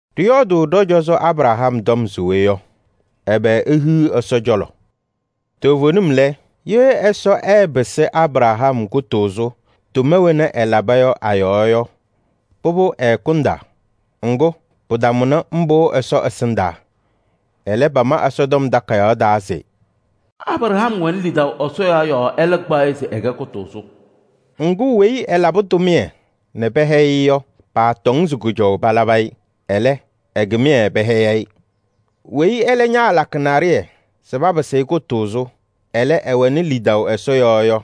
Ɖɩyɔɔdʋʋ ɖɔ-cɔzɔ Abraham tɔm se we yɔ? Ɛbɛ ehiɣ Ɛsɔ cɔlɔ? Toovenim lɛ, ye Ɛsɔ ɛɛpɩsɩ Abraham kʋtʋʋzʋ tʋma wena ɛlaba yɔ a-yɔɔ yɔ, pʋbʋ ɛɛkʋndaa. Ŋgʋ, pɩtamʋnɩ mbʋ Ɛsɔ ɛsɩndaa. Ɛlɛ pama Ɛsɔtɔm Takayaɣ taa se: “Abraham wɛnɩ lidaʋ Ɛsɔ yɔɔ yɔɔ, ɛlɛ kpaɣ-ɩ se ɛkɛ kʋtʋʋzʋ.” Ŋgʋ, weyi ɛlabɩ tʋmɩyɛ nɛ pɛhɛyɩ-ɩ yɔ, paatɔŋ se kʋjɔʋ palabɩ-ɩ. Ɛlɛ, ɛ-kɩmɩyɛ pɛhɛyɩ-ɩ. Weyi ɛlɛ ñaalakɩ naɖɩyɛ se papɩsɩ-ɩ kʋtʋʋzʋ, ɛlɛ, ɛwɛnɩ lidaʋ Ɛsɔ yɔɔ yɔ,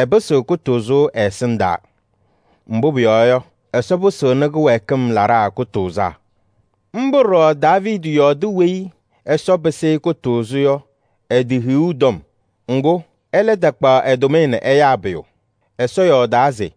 ɛpɩsɩɣ kʋtʋʋzʋ ɛ-ɛsɩndaa. Mbʋ pʋyɔɔ yɔ, Ɛsɔ pɩsɩɣnɩ kɩwɛɛkɩm laɖaa kʋtʋʋzaa. Mbʋ ɖɔɖɔ Daaviidi yɔɔdɩ weyi Ɛsɔ pɩsɩ-ɩ kʋtʋʋzʋ yɔ ɛ-tɩ hiɣu tɔm. Ŋgʋ, ɛlɛ taakpaɣ ɛ-tʋmɩyɛ nɛ ɛyaa pʋyʋ. Ɛyɔɔdaa se: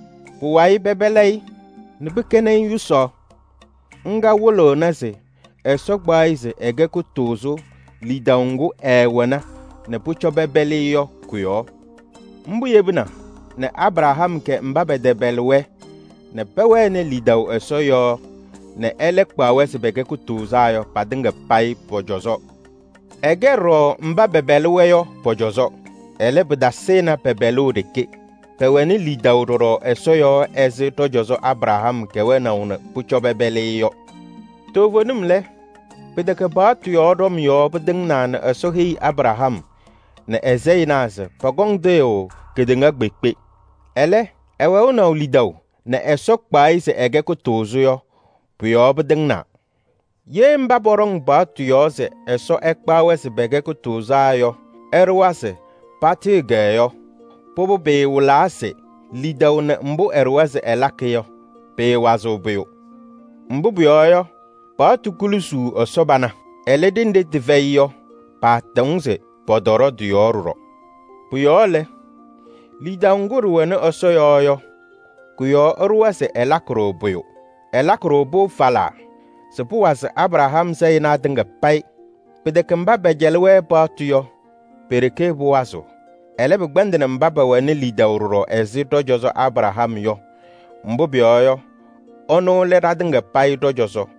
Pʋwayɩ pɛpɛlɩ-ɩ nɛ pɩkɛnɩ-ɩ yʋsaɣ: ŋga wɩlɩɣna se Ɛsɔ kpaɣ-ɩ se ɛkɛ kʋtʋʋzʋ lidaʋ ŋgʋ ɛɛwɛna nɛ pʋcɔ pɛpɛlɩ-ɩ yɔ kʋ-yɔɔ. Mbʋ yebina nɛ Abraham kɛ mba pɛtɛpɛlɩ-wɛ nɛ pɛwɛnɩ lidaʋ Ɛsɔ yɔɔ nɛ ɛlɛ kpaɣ-wɛ se pɛkɛ kʋtʋʋzaa yɔ patɩŋa payɩ pɔ-cɔzɔ. Ɛkɛ ɖɔɖɔ mba pɛpɛlɩ-wɛ yɔ pɔ-cɔzɔ. Ɛlɛ, pɩtasɩnɩ pɛ-pɛlʋʋ ɖeke, pɛwɛnɩ lidaʋ ɖɔɖɔ Ɛsɔ yɔɔ ɛzɩ ɖɔ-cɔzɔ Abraham kɛwɛnaʋ nɛ pʋcɔ pɛpɛlɩ-ɩ yɔ. Toovenim lɛ, pɩtɛkɛ paɣtʋ yɔɔ ɖɔm yɔɔ pɩtɩŋnaa nɛ Ɛsɔ heyi Abraham nɛ ɛ-sayɩnaa se pɔkɔŋ tɩɣyʋʋ kedeŋa kpeekpe. Ɛlɛ, ɛwɛʋnɩ lidaʋ nɛ Ɛsɔ kpaɣ-ɩ se ɛkɛ kʋtʋʋzʋ yɔ, pʋ-yɔɔ pɩtɩŋnaa. Ye mba pɔɖɔŋ paɣtʋ yɔɔ se Ɛsɔ ɛkpaɣ-wɛ se pɛkɛ kʋtʋʋzaa yɔ ɛɖʋwa se patɩɣyɩ-kɛ yɔ, pʋbʋ pɩɩwɩlaa se lidaʋ nɛ mbʋ ɛɖʋwa se ɛlakɩ yɔ, pɩɩwazɩɣ pʋyʋ. Mbʋ pʋyɔɔ yɔ, paɣtʋ kulusuu Ɛsɔ pana. Ɛlɛ, ɖenɖe tɩfɛyɩ yɔ, paatɔŋ se pɔtɔɖɔ tɩ-yɔɔ ɖɔɖɔ. Pʋ-yɔɔ lɛ, lidaʋ ŋgʋ ɖɩwɛnɩ Ɛsɔ yɔɔ yɔ, kʋ-yɔɔ ɛɖʋwa se ɛlakɩ-ɖʋ pʋyʋ. Ɛlakɩ-ɖʋ-pʋ falaa se pʋwazɩ Abraham sayɩnaa tɩŋa payɩ. Pɩtɛkɛ mba pɛcɛlɩ-wɛ paɣtʋ yɔ, pe-ɖeke pʋwazɩɣ. Ɛlɛ, pɩkpɛndɩnɩ mba pɛwɛnɩ lidaʋ ɖɔɖɔ ɛzɩ ɖɔ-cɔzɔ Abraham yɔ, mbʋ pʋyɔɔ yɔ, ɛnʋ lɛ ɖatɩŋa payɩ ɖɔ-cɔzɔ.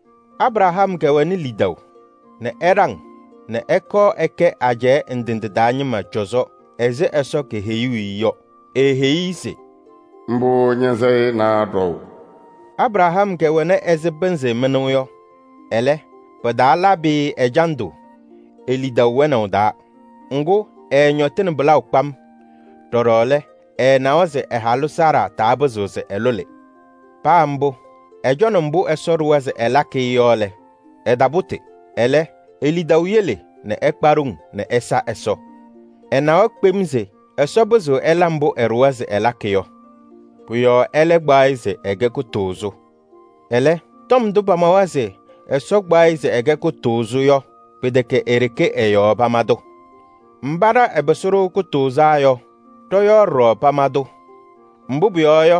Abraham kɛwɛnɩ lidaʋ nɛ ɛɖaŋ nɛ ɛkɔɔ ɛkɛ ajɛɛ ndɩ ndɩ taa ñɩma cɔzɔ ɛzɩ Ɛsɔ keheyuu-i yɔ. Eeheyi-i se: “Mbʋ ña-sayɩnaa ɖɔʋ.” Abraham kɛwɛna ɛzɩ pɩnzɩ mɩnʋʋ yɔ. Ɛlɛ, pɩtaalabɩ-ɩ ɛjandʋ e-lidaʋ wɛnaʋ taa, ŋgʋ, ɛɛñɔtɩnɩ pɩlaʋ kpam. Ɖɔɖɔ lɛ, ɛɛnawa se ɛ-halʋ Saara tapɩzɩɣ se ɛlʋlɩ. Paa mbʋ, ɛcɔnɩ mbʋ Ɛsɔ ɖʋwa se ɛlakɩ-ɩ yɔ lɛ, ɛtapʋtɩ. Ɛlɛ, e-lidaʋ yele nɛ ɛkpa ɖoŋ nɛ ɛsa Ɛsɔ. Ɛnawa kpem se Ɛsɔ pɩzɩɣ ɛla mbʋ ɛɖʋwa se ɛlakɩ yɔ. Pʋ-yɔɔ ɛlɛ kpaɣ-ɩ se ɛkɛ kʋtʋʋzʋ. Ɛlɛ, tɔm ndʋ pamawa se: “Ɛsɔ kpaɣ-ɩ se ɛkɛ kʋtʋʋzʋ” yɔ, pɩtɛkɛ e-ɖeke ɛ-yɔɔ pama-tʋ. Mba ɖa ɛpɩsɩ-ɖʋ kʋtʋʋzaa yɔ, ɖɔ-yɔɔ ɖɔɖɔ pama-tʋ. Mbʋ pʋyɔɔ yɔ,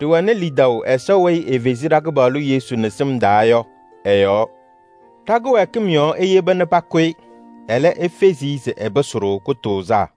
ɖɩwɛnɩ lidaʋ Ɛsɔ weyi efezi ɖa-Kɩpaɣlʋ Yesu nɛ sɩm yɔɔ yɔ ɛ-yɔɔ. Ɖa-kɩwɛɛkɩm yɔɔ eyeba nɛ pakʋ-ɩ, ɛlɛ, efezi-i se ɛpɩsɩ-ɖʋ kʋtʋʋzaa.